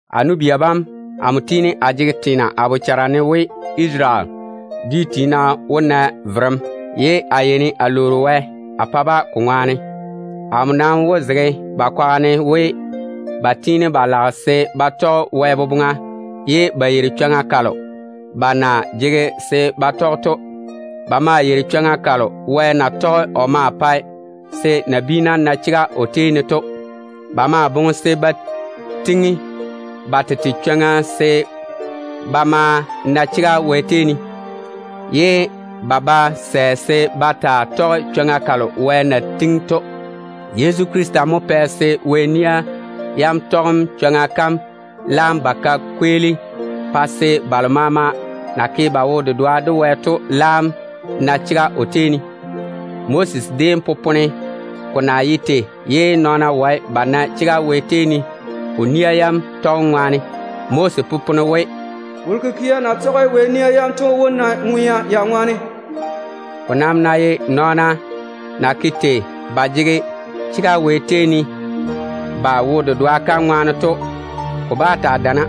A nu-bia bam, amo tiini a jege teena a bochare ne we Isarele dwi tiina wó na verem, ye a yeini a lwoori Wɛ a pa-ba ko ŋwaane. Amo nam wó zege ba kwaga ne we, ba tiini ba lage se ba tɔge Wɛ boboŋa ye ba yeiri chwoŋa kalo ba na jege se ba tɔge to. Ba maa yeiri chwoŋa kalo Wɛ na tɔge o maa pae se nabiina na chega o tei ne to. Ba maa boŋe se ba tiŋi ba tete chwoŋa se ba maa na chega Wɛ tei ne, ye ba ba sɛ se ba taa tɔge chwoŋa kalo Wɛ na tiŋi to. Yezu Krista mo pɛ se Wɛ nia yam tɔgem chwoŋa kam laam ba ka kweeli, pa se balo maama na ke ba wo-dedoa de Wɛ to laam na chega o tei ne. Moses déem popone ko na ye tei ye nɔɔna wae ba na chega Wɛ tei ne o nia yam tɔgem ŋwaane. Moses popone we, “Wolo kikia na tɔge Wɛ nia yam to wó na ŋwea ya baŋa ne.” Ko nam ná ye nɔɔna na ke tei ba jege chega Wɛ tei ne ba wo-dedoa kam ŋwaane to, ko bá taa dana.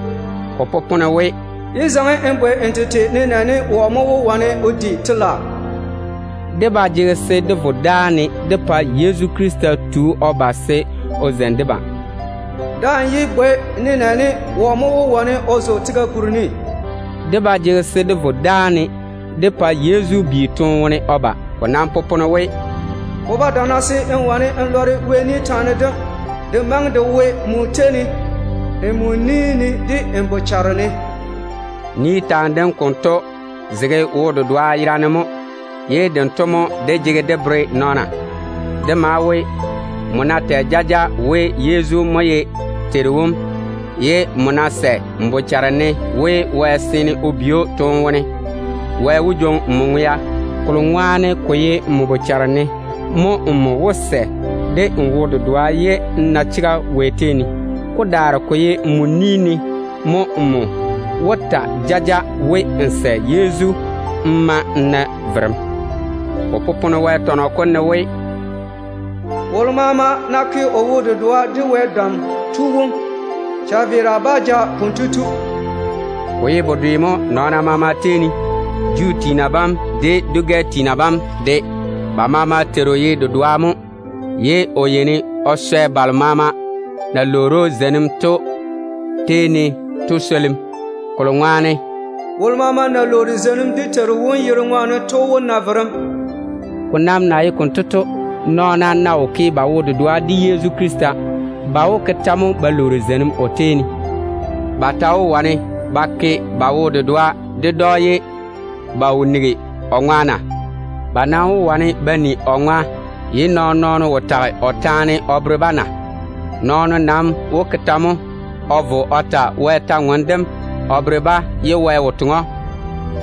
Ko popone we, “Yé bwei n tete ne nenɛɛne, wɔ mo wó wane o di telaao?” Dé ba jege se dé vo dáane dé pa Yezu Krista tu o ba se o zeini debam. “Daa‑n yé bwei nenɛɛne, wɔ mo wó wane o zo tega kuri ne?” Dé ba jege se dé vo dáane dé pa Yezu bi toone wone o ba. Ko nam popone we, “Ko ba dana se n wane n lɔre Wɛ kwora kam. Ka maŋe ka wo nmo tei ne, de nmo ni ne, de nmo bochare ne.” Kwora kam konto zege wo-dedoa yera ne mo, ye kanto mo dé jege dé bere nɔɔna. Ka maa we, nmo ná tɛ jaja we Yezu mo ye Teiru wom, ye nmo ná sɛ de n bochare maama we Wɛ seene o bi‑o toone wone, Wɛ wó jwoŋi nmo ŋwea. Kolo ŋwaane ko ye nmo bochare ne mo nmo wó sɛ de n wo-dedoa ye n na chega Wɛ tei ne. Ko daare ko ye nmo ni ne mo nmo wó ta jaja we, n sɛ Yezu pa n na verem. Ko popone Wɛ tɔnɔ kom ne we, “Wolo maama ná ke o wo-dedoa de Wɛ Dam Tu wom, chaveera bá ja kotu.” Ko ye bedwe mo nɔɔna maama tei ne, Juu tiina bam de dwi-gɛ tiina bam de. Ba maama Teiru ye dedoa mo, ye o yeini o swɛ balo maama na lwoori zeinim o tei ne to swolim. Kolo ŋwaane, “Wolo maama ná bwoŋi dé Teiru wom yere o ma lwoori zeinim, kotu wó na verem.” Ko nam na ye konto to, nɔɔna ná wo ke ba wo-dedoa de Yezu Krista, ba wó ke tɛ mo ba lwoori zeinim o tei ne? Ba ta wó wane ba ke ba wo-dedoa ded‑o ye ba wo nigi o kwora na? Ba nam wó wane ba ni o kwora ye nɔɔn-nɔɔno wo tɔɔle-ka o bere-ba na? Nɔɔno nam wó ke tɛ mo o vo o tɔɔle Wɛ kwora kam o bere-ba ye Wɛ wo toŋe‑o?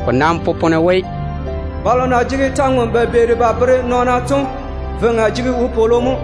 Ko nam popone we, “Balo na jege kwor-ywoŋa ba beeri ba bwooli to veiŋa jege ywoni mo.”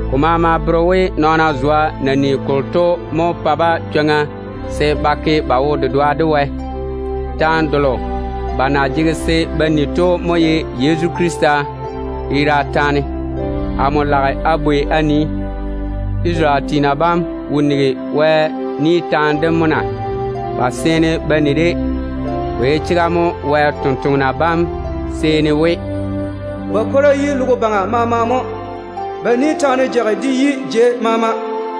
Ko maama bere we nɔɔna zwa na ni kolo to mo pa-ba chwoŋa se ba ke ba wo-dedoa de Wɛ. Kwora kalo ba na jege se ba ni to mo ye Yezu Krista yera taane. Amo lage a bwei a nii, Isarele tiina bam wo nigi Wɛ ni taane dem mo na? Ba seene ba ni-de. Ko ye chega mo Wɛ tontoŋena bam seeni we: “Ba kwora kam yi logo baŋa jei maama mo. Ba ni taane jage de yi dɔŋɔ ni maama.”